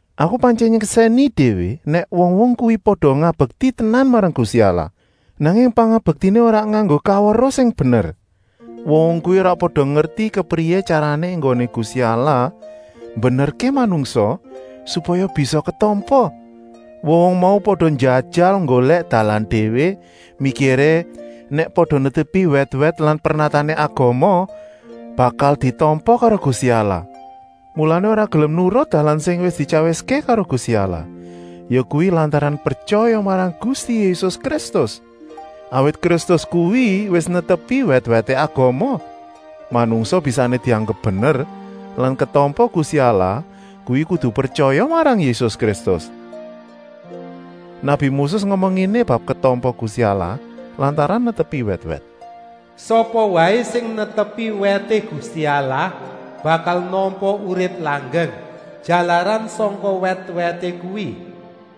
Aku pantyèn nyeksèni déwé nèk wong-wong kuwi pada ngabekti tenan marang Gusti Allah, nanging pangabektiné ora nganggo kaweruh sing bener. Wong-wong kuwi ora pada ngerti kepriyé tyarané enggoné Gusti Allah mbenerké manungsa, supaya bisa ketampa. Wong-wong mau pada njajal nggolèk dalan déwé, mikiré, nèk pada netepi wèt-wèt lan pernatané agama, bakal ditampa karo Gusti Allah. Mulané ora gelem nurut dalan sing wis dityawiské karo Gusti Allah, yakuwi lantaran pretyaya marang Gusti Yésus Kristus. Awit Kristus kuwi wis netepi wèt-wèté agama. Manungsa bisané dianggep bener lan ketampa Gusti Allah kuwi kudu pretyaya marang Yésus Kristus. Nabi Moses ngomong ngéné bab ketampa Gusti Allah lantaran netepi wèt-wèt: “Sapa waé sing netepi wèté Gusti Allah bakal nampa urip langgeng, jalaran sangka wèt-wèté kuwi.”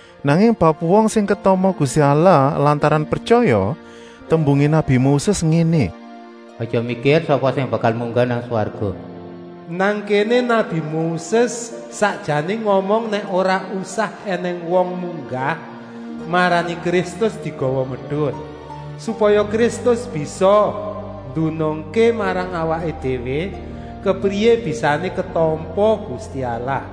Nanging bab wong sing ketampa Gusti Allah lantaran pretyaya tembungé nabi Moses ngéné: “Aja mikir: sapa sing bakal munggah nang swarga?” Nang kéné nabi Moses sakjané ngomong nèk ora usah ènèng wong munggah marani Kristus digawa medun, supaya Kristus bisa ndunungké marang awaké déwé, kepriyé bisané ketampa Gusti Allah.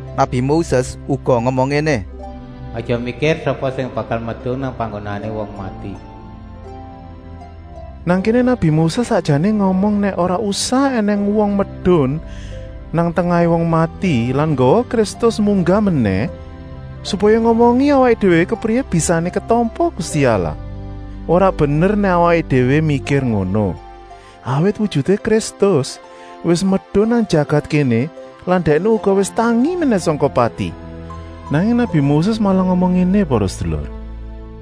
Nabi Moses uga ngomong ngéné: “Aja mikir: sapa sing bakal medun nang panggonané wong mati?” Nang kéné nabi Moses sakjané ngomong nèk ora usah ènèng wong medun nang tengahé wong mati lan nggawa Kristus munggah menèh, supaya ngomongi awaké déwé kepriyé bisané ketampa Gusti Allah. Ora bener nèk awaké déwé mikir ngono, awit wujuté Kristus wis medun nang jagat kéné lan Dèkné uga wis tangi menèh sangka pati. Nanging nabi Moses malah ngomong ngéné para sedulur: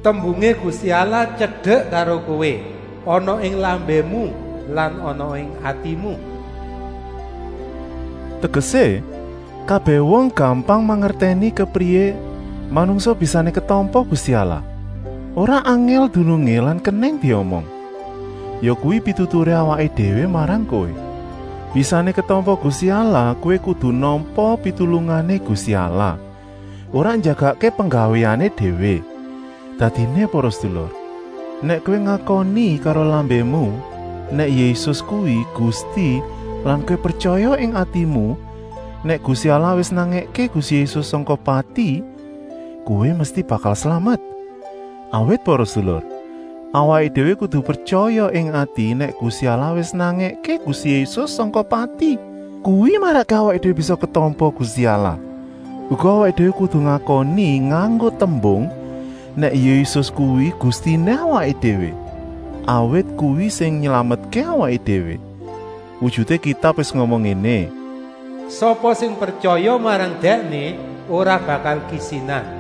“Tembungé Gusti Allah tyedek karo kowé, ana ing lambému lan ana ing atimu.” Tegesé, kabèh wong gampang mangertèni kepriyé manungsa bisané ketampa Gusti Allah. Ora angèl dunungé lan kenèng diomong. Yakuwi pituturé awaké déwé marang kowé: bisané ketampa Gusti Allah kowé kudu nampa pitulungané Gusti Allah, ora njagakké penggawéné déwé. Dadiné para sedulur, nèk kowé ngakoni karo lambému nèk Yésus kuwi Gusti lan kowé pretyaya ing atimu nèk Gusti Allah wis nangèké Gusti Yésus sangka pati, kowé mesti bakal slamet. Awit para sedulur, awaké déwé kudu pretyaya ing ati nèk Gusti Allah wis nangèké Gusti Yésus sangka pati. Kuwi marakké awaké déwé bisa ketampa Gusti Allah. Uga awaké déwé kudu ngakoni nganggo tembung, nèk Yésus kuwi Gustiné awaké déwé, awit kuwi sing nylametké awaké déwé. Wujuté Kitab wis ngomong ngéné: “Sapa sing pretyaya marang Dèkné ora bakal kisinan.”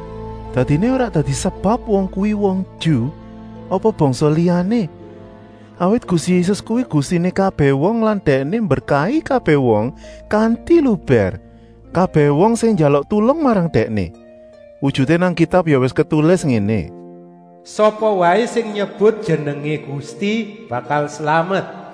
Dadiné ora dadi sebab wong kuwi wong Ju apa bangsa liyané, awit Gusti Yésus kuwi Gustiné kabèh wong lan Dèkné mberkahi kabèh wong kanti lubèr, kabèh wong sing njaluk tulung marang Dèkné. Wujuté nang Kitab ya wis ketulis ngéné: “Sapa waé sing nyebut jenengé Gusti bakal slamet.”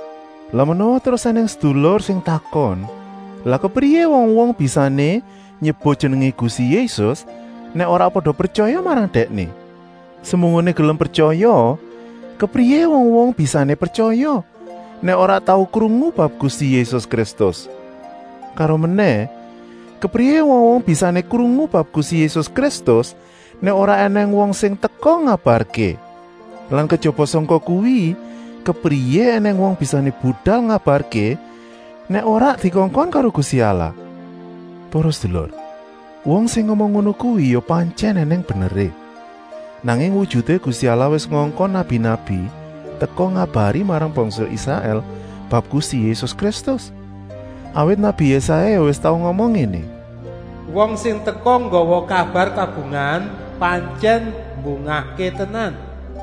Lah menawa terus ènèng sedulur sing takon: “Lah kepriyé wong-wong bisané nyebut jenengé Gusti Yésus, nèk ora pada pretyaya marang Dèkné. Semunggoné gelem pretyaya, kepriyé wong-wong bisané pretyaya, nèk ora tau krungu bab Gusti Yésus Kristus. Karomenèh, kepriyé wong-wong bisané krungu bab Gusti Yésus Kristus, nèk ora ènèng wong sing teka ngabarké. Lan kejaba sangka kuwi, kepriyé ènèng wong bisané budal ngabarké, nèk ora dikongkon karo Gusti Allah?” Para sedulur, wong sing ngomong ngono kuwi ya pantyèn ènèng beneré. Nanging wujuté Gusti Allah wis ngongkon nabi-nabi teka ngabari marang bangsa Israèl bab Gusti Yésus Kristus. Awit nabi Yésaya ya wis tau ngomong ngéné: “Wong sing teka nggawa kabar kabungahan pantyèn mbungahké tenan!”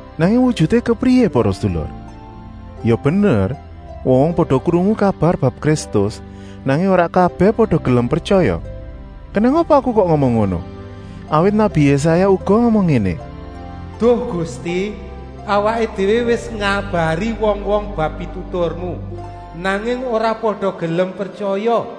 Nanging wujuté kepriyé para sedulur? Ya bener wong-wong pada krungu kabar bab Kristus, nanging ora kabèh pada gelem pretyaya. Kenèng apa aku kok ngomong ngono? Awit nabi Yésaya uga ngomong ngéné: “Duh Gusti, awaké déwé wis ngabari wong-wong bab pituturmu, nanging ora pada gelem pretyaya.”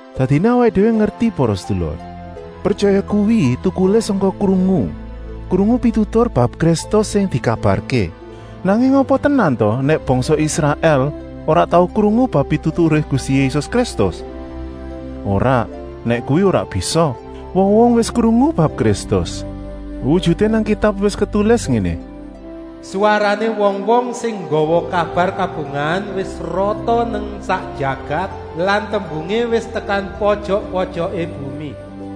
Dadiné awaké déwé ngerti para sedulur, pretyaya kuwi tukulé sangka krungu, krungu pitutur bab Kristus sing dikabarké. Nanging apa tenan ta nèk bangsa Israèl ora tau krungu bab pituturé Gusti Yésus Kristus? Ora, nèk kuwi ora bisa. Wong-wong wis krungu bab Kristus. Wujuté nang Kitab wis ketulis ngéné: “Swarané wong-wong sing nggawa kabar kabungahan wis rata nang sak jagat lan tembungé wis tekan pojok-pojoké bumi.”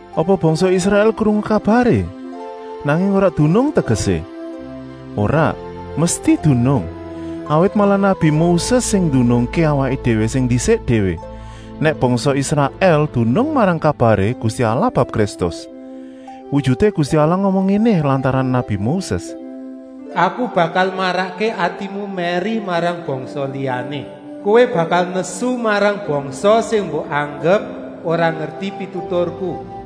Apa bangsa Israèl krungu kabaré, nanging ora dunung tegesé? Ora, mesti dunung, awit malah nabi Moses sing ndunungké awaké déwé sing ndisik déwé, nèk bangsa Israèl dunung marang kabaré Gusti Allah bab Kristus. Wujuté Gusti Allah ngomong ngéné lantaran nabi Moses: “Aku bakal marakké atimu mèri marang bangsa liyané. Kowé bakal nesu marang bangsa sing mbok anggep ora ngerti pituturku.”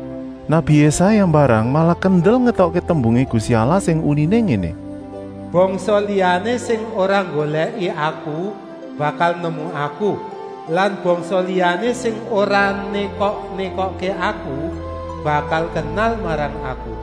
Nabi Yésaya mbarang malah kendel ngetokké tembungé Gusti Allah sing uniné ngéné: “Bangsa liyané sing ora nggolèki Aku bakal nemu Aku lan bangsa liyané sing ora nékok-nékokké Aku bakal kenal marang Aku.”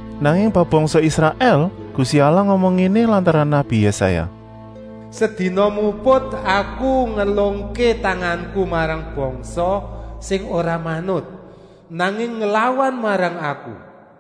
Nanging bab bangsa Israèl Gusti Allah ngomong ngéné lantaran nabi Yésaya: “Sedina muput Aku ngelungké tanganku marang bangsa sing ora manut, nanging nglawan marang Aku!”